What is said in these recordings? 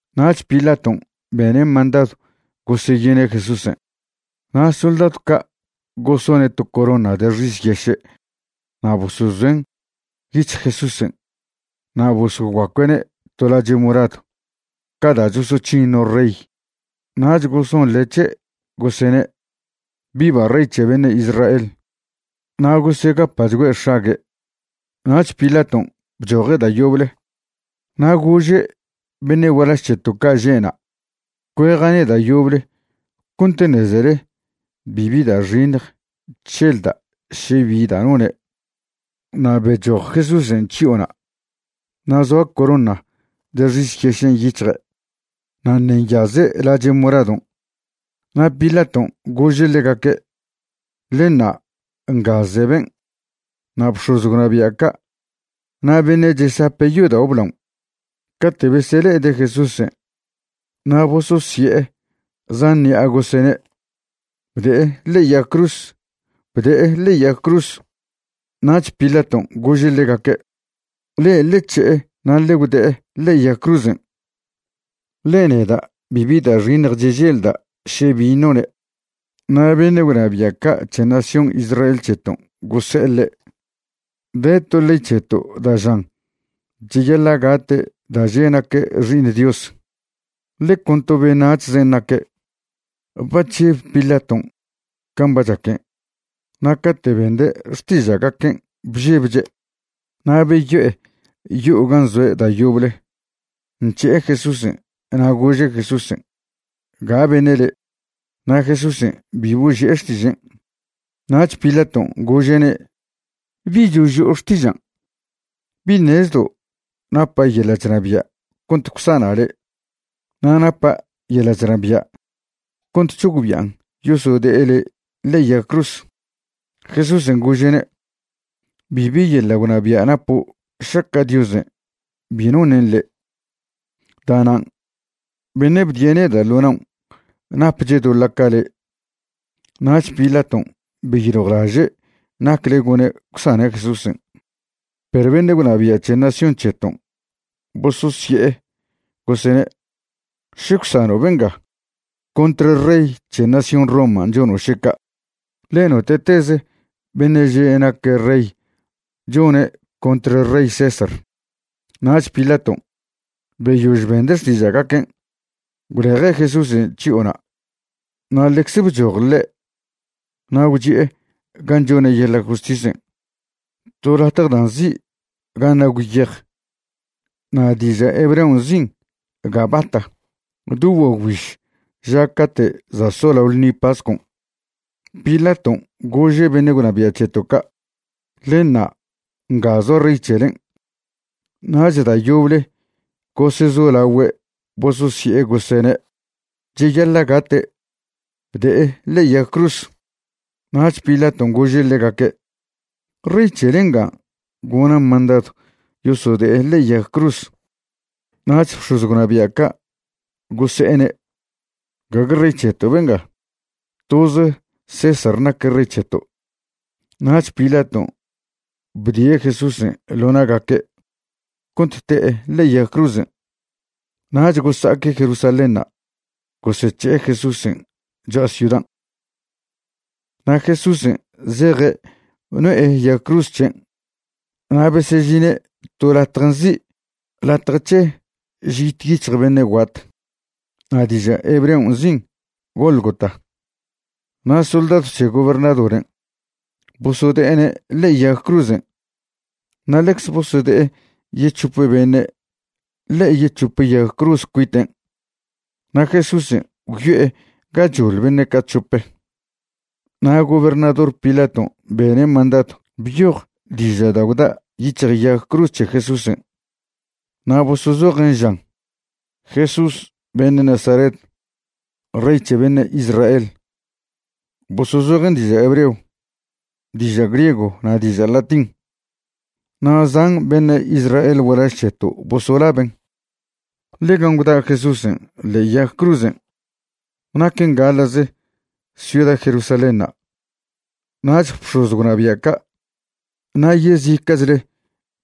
Nach Pilaton' bene' mandadw goseyine' Jesúsen'. Na' soldadw ca' gosone' to corona de xis yeše' na' bosozoen' yic̱hj Jesúsen' na' bosoguacue'ne' to lache' moradw ca da' chosoc̱hin no rey. Nach gosonḻe' c̱he', gosene': ―¡Viva Rey c̱he beṉe' Israel! Na' gosegapa'chgüe' x̱ague'. Nach Pilaton' bchoje' da' yoble na' gože' beṉe' gualaž c̱heto' ca' že' na': ―Cueja'ne' da' yoble cont ṉezele bibi da' xiṉj chželda' še bi da' none'. Na' bechoj Jesúsen' chyo'ona', na' zoa corona de xis yešen' yic̱hje' na' ṉe' nyaze' lache' moradon'. Na' Pilaton' gože' ḻegaque': ―Ḻe ṉa', nga ze ben'. Na' bx̱oz gwnabia' ca' na' beṉe' chesape' yodao' blaon' cate' besele'ede' Jesúsen' na' bososye'e zan ṉi'a gosene': ―¡Bde'e ḻe'e yag cruz! ¡Bde'e ḻe'e yag cruz! Nach Pilaton' gože' ḻegaque': ―Le'e ḻe c̱he'e na' ḻe gwde'e ḻe'e yag cruzen', ḻe neda' bibi da' xiṉj cheželda' še bin' none'. Na' beṉe' gwnabia' ca' c̱he nación Israel c̱heton' gose'e ḻe': ―De to ley c̱heto' da' žan cheyaḻa' gate' da' že' naque' Xi'iṉ Dios, ḻe con to beṉac̱hzen' naque'. Ba chžeb Pilaton' can' ba chaquen', na' cate' bende' xtiža'gaquen' bžebche'. Na' beyo'e yo'o gan' zoe' da' yoble, nc̱he'e Jesúsen', na' gože' Jesúsen': ―¿Ga beṉe' le'? Na' Jesúsen' bi boži'e xtižen'. Nach Pilaton' gože'ne': ―¿Bi choži'o xtižan'? ¿Bi ṉezdo' napa' yeḻa' chnabia' cont gwsana' le' na' napa' yeḻa' chnabia' cont c̱hogbi'an yosode'e le' ḻe'e yag cruz? Jesúsen' gože'ne': ―Bibi yeḻa' gwnabia' napo' šaca' Diosen' bi noṉen' le'. Da'nan' beṉe' bdie' neda' ḻo naon' napche' doḻa' ca le'. Nach Pilaton' beyiljwlaže' nacle gone' gwsane' Jesúsen'. Perw beṉe' gwnabia' c̱he nación c̱heton' bososye'e gosene': ―Še gwsano' benga, contr rey c̱he nación Roman' chono' še ca', ḻe note'tez beṉe' že' naque' rey chone' contr rey César. Nach Pilaton', beyož bende' xtiža'gaquen', gwleje' Jesúsen' chyo'ona' na' ḻecze bchoj ḻe' na' gwchi'e gan' chone' yeḻa' justisen', to latje da' nzi' Gan' Nagw Yej, na' diža' hebreo nzin' Gabata. Do guagwbiž ža cate' za' solao ḻṉi pascon' Pilaton' gože' beṉe' gwnabia' c̱heto' ca': ―Ḻe ṉa', nga zoa rey c̱helen'. Nach da' yoble gosezolagüe' bososye'e gosene': ―¡Cheyaḻa' gate'! ¡Bde'e ḻe'e yag cruz! Nach Pilaton' gože' ḻegaque': ―¿Rey c̱hele nga gona' mandadw yosode'e ḻe'e yag cruz? Nach bx̱oz gwnabia' ca' gose'ene': ―Gague rey c̱heto' benga. Toze César naque' rey c̱heto'. Nach Pilaton' bdie' Jesúsen' ḻo na'gaque' cont te'e ḻe'e yag cruzen'. Nach gosa'aque' Jerusalénṉa' gosec̱he'e Jesúsen' cho'a ciudan'. Na' Jesúsen' zeje' no'e yag cruz c̱hen' na' besežine' to latje nzi' Latje c̱he Žit Yic̱hj Beṉe' Guat, na' diža' hebreo nzin' Gólgota. Na' soldadw c̱he gobernadoren' bosode'ene' ḻe'e yag cruzen', na' ḻecze bosode'e yec̱hope beṉe' ḻe'e yec̱hope yag cruz cuiten' na' Jesúsen' gwyo'e gachoḻ beṉe' ca' c̱hope'. Na' gobernador Pilaton' bene' mandadw byoj diža' da' gwda' yic̱hj yag cruz c̱he Jesúsen'. Na' bosozojen' žan: “Jesús beṉe' Nazaret, Rey c̱he beṉe' Israel”. Bosozojen' diža' hebreo, diža' griego na' diža' latín. Na' zan beṉe' Israel gualaž c̱heto' bosolaben', ḻe gan' gwda' Jesúsen' ḻe'e yag cruzen' naquen gaḻa'ze ciuda Jerusalénṉa'. Nach bx̱oz gwnabia' ca' na' yezica'chle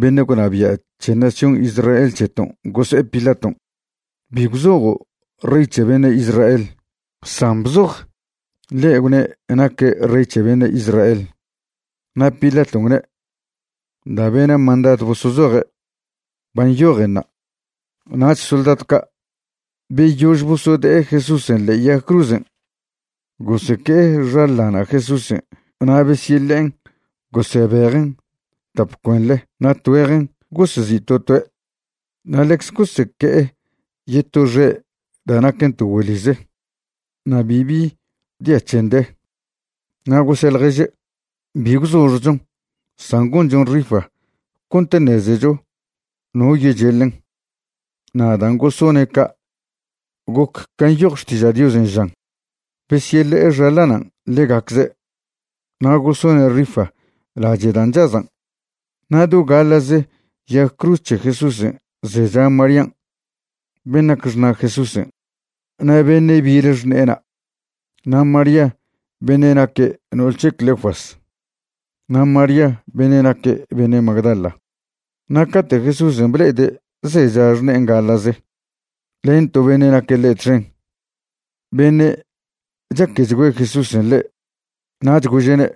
beṉe' gwnabia' c̱he nación Israel c̱heton' gose'e Pilaton': ―Bi gwzojo' “Rey c̱he beṉe' Israel”, san bzoj: “Ḻe' gwne' naque' rey c̱he beṉe' Israel.” Na' Pilaton' gwne': ―Da' bena' mandadw bosozoje', ba nyojenṉa'. Nach soldadw ca', beyož bosode'e Jesúsen' ḻe'e yag cruzen', goseque'e xaḻana' Jesúsen' na' besyeḻe'en gosebejen' tap cuenḻe na' tgüejen gosezi' to toe'. Na' ḻecze goseque'e yeto xe' da' naquen to güeḻize, na' bibi dia c̱hen de. Na' gose' ḻježe': ―Bi gwzoxjchon san gonchon rifa cont ṉezecho no yecheḻen. Na' dan' gosone' ca' goc can' nyoj Xtiža' Diosen', žan: “Besyeḻe'e xaḻanan' ḻegacze', na' gosone' rifa lache' dan' chazan'.” Na' do gaḻa'ze yag cruz c̱he Jesúsen' zecha Marían' ben' nac xṉa' Jesúsen' na' beṉe' bile xṉe'ena', na' María beṉe' naque' no'ol c̱he Cleofas na' María beṉe' naque' beṉe' Magdala. Na' cate' Jesúsen' ble'ede' zecha xṉe'en gaḻa'ze len to beṉe' naque' ḻe' txen, beṉe' chaquechgüe Jesúsen' ḻe', nach gože'ne':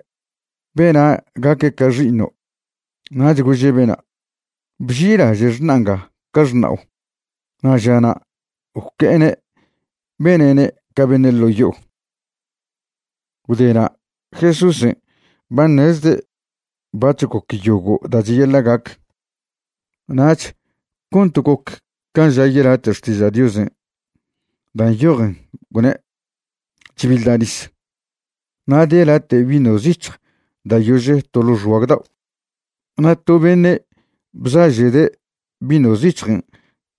―Bena' gaque' ca xi'iṉo'. Nach gože' bena': ―Bži'ilaže' xṉa' nga ca xṉao'. Na' žana' gwque'ene' bene'ne' ca beṉe' ḻo' yo'o. Gwde na' Jesúsen' ba ṉezde' bac̱h goc yogo' da' cheyaḻa' gac. Nach cont goc can' ža yelate' Xtiža' Diosen' da' nyojen gwne': ―Chbiḻda' nis. Na' de late' vino zic̱hj da' yože' to ḻo' xguag dao'. Na' to beṉe' bzaže'de' vino zic̱hjen'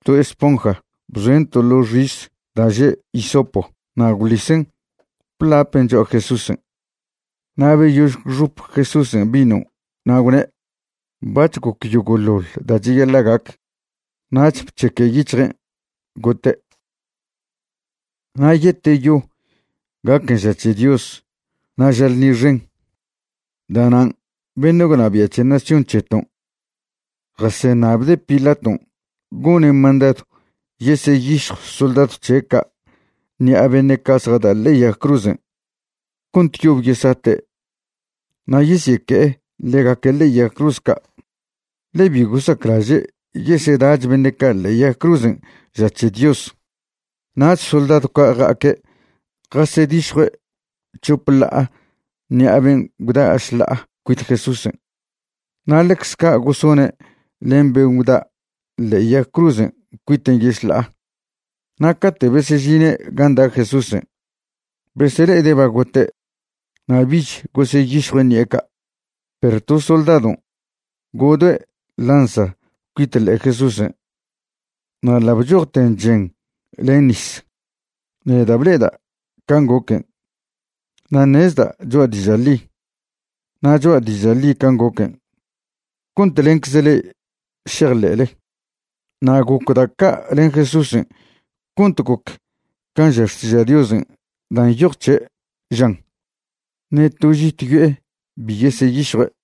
to esponja bzoen' to ḻo' xis da' že' hisopo na' gwḻisen' blapen' cho'a Jesúsen'. Na' beyož gwxop Jesúsen' vinon' na' gwne': ―Bac̱h goc yogo'ḻoḻ da' cheyaḻa' gac. Nach bc̱heque' yic̱hjen' gote'. Na' yeteyo gaquen ža c̱he Dios na' ža ḻṉi xen, da'nan' beṉe' gwnabia' c̱he nación c̱heton' jaseṉabde' Pilaton' gone' mandadw yeseyišjw soldadw c̱he' ca' ṉi'a beṉe' ca' zjada' ḻe'e yag cruzen' cont yob yesate' na' yesyeque'e ḻegaque' ḻe'e yag cruz ca', ḻe bi gosaclaže' yeseda'ch beṉe' ca' ḻe'e yag cruzen' ža c̱he Dios. Nach soldadw ca' ja'aque' jasedišjue' chope ḻa'a ṉi'a ben' gwda' šḻa'a cuit Jesúsen'. Na' ḻecze ca' gosone' len ben' gwda' ḻe'e yag cruzen' cuiten' yešḻa'a. Na' cate' besežine' gan' da' Jesúsen', besele'ede' ba gote' na' bich goseyišjue' ṉi'e ca'. Perw to soldadon' godoe' lanza cuit ḻe'e Jesúsen', na' ḻa' bchojten chen len nis. Neda' ble'eda' can' goquen' na' ṉezda' cho'a diža' ḻi. Na' cho'a diža' ḻi can' goquen' cont lencze le'e šejḻe'le. Na' goc da' ca' len Jesúsen' cont goc can' ža Xtiža' Diosen' da' nyoj c̱he', žan: “Ṉe to žit yo'e bi yeseyišjue'.”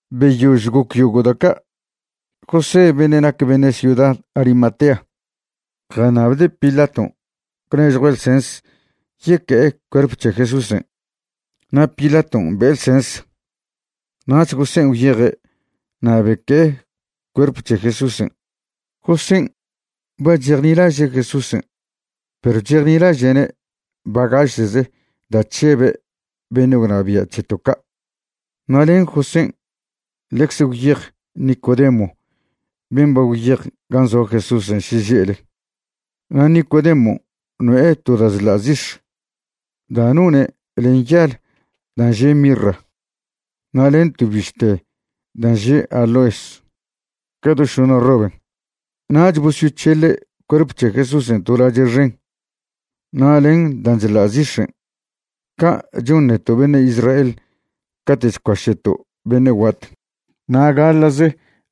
Beyož goc yogo' da' ca', José beṉe' nac beṉe' ciuda Arimatea jaṉabde' Pilaton' gwnežjue' ḻsens yeque'e cuerp c̱he Jesúsen'. Na' Pilaton' be'e ḻsens. Nach Josén' gwyeje' na' beque'e cuerp c̱he Jesúsen'. Josén' ba chejnilaže' Jesúsen' perw chejnilaže'ne' bagaše'ze da' chžebe' beṉe' gwnabia' c̱heto' ca'. Na' len Josén' ḻecze gwyej Nicodemo ben' ba gwyej gan' zoa Jesúsen' šeže'le. Na' Nicodemon' no'e to da' chḻa' zix̱ da' none' len yal dan' že' mirra, na' len to bište dan' že' aloes, ca do šoṉa roben'. Nach bosyoc̱hele' cuerp c̱he Jesúsen' to lache' xen na' len dan' chḻa' zix̱en', ca' chon neto' beṉe' Israel cate' chcuaše'to' beṉe' guat. Na' gaḻa'ze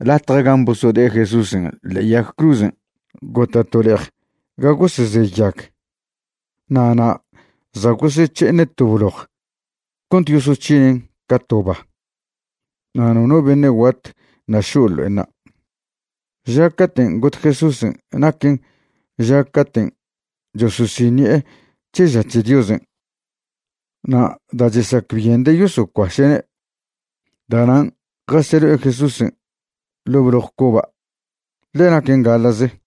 latje gan' bosode'e Jesúsen' ḻe'e yag cruzen' gota' to le'ej ga goseze yag. Na' na' za' gosec̱he'ene' to bloj cont yosoc̱hinen' ca to ba, na' nono beṉe' guat ṉa' šo' ḻo'enṉa'. Ža caten' got Jesúsen' naquen ža caten' chososiṉi'e c̱he ža c̱he Diosen'. Na' da' chesacbyende' yosocuaše'ne', da'nan' jaseḻo'e Jesúsen' ḻo' bloj coba', ḻe naquen gaḻa'ze.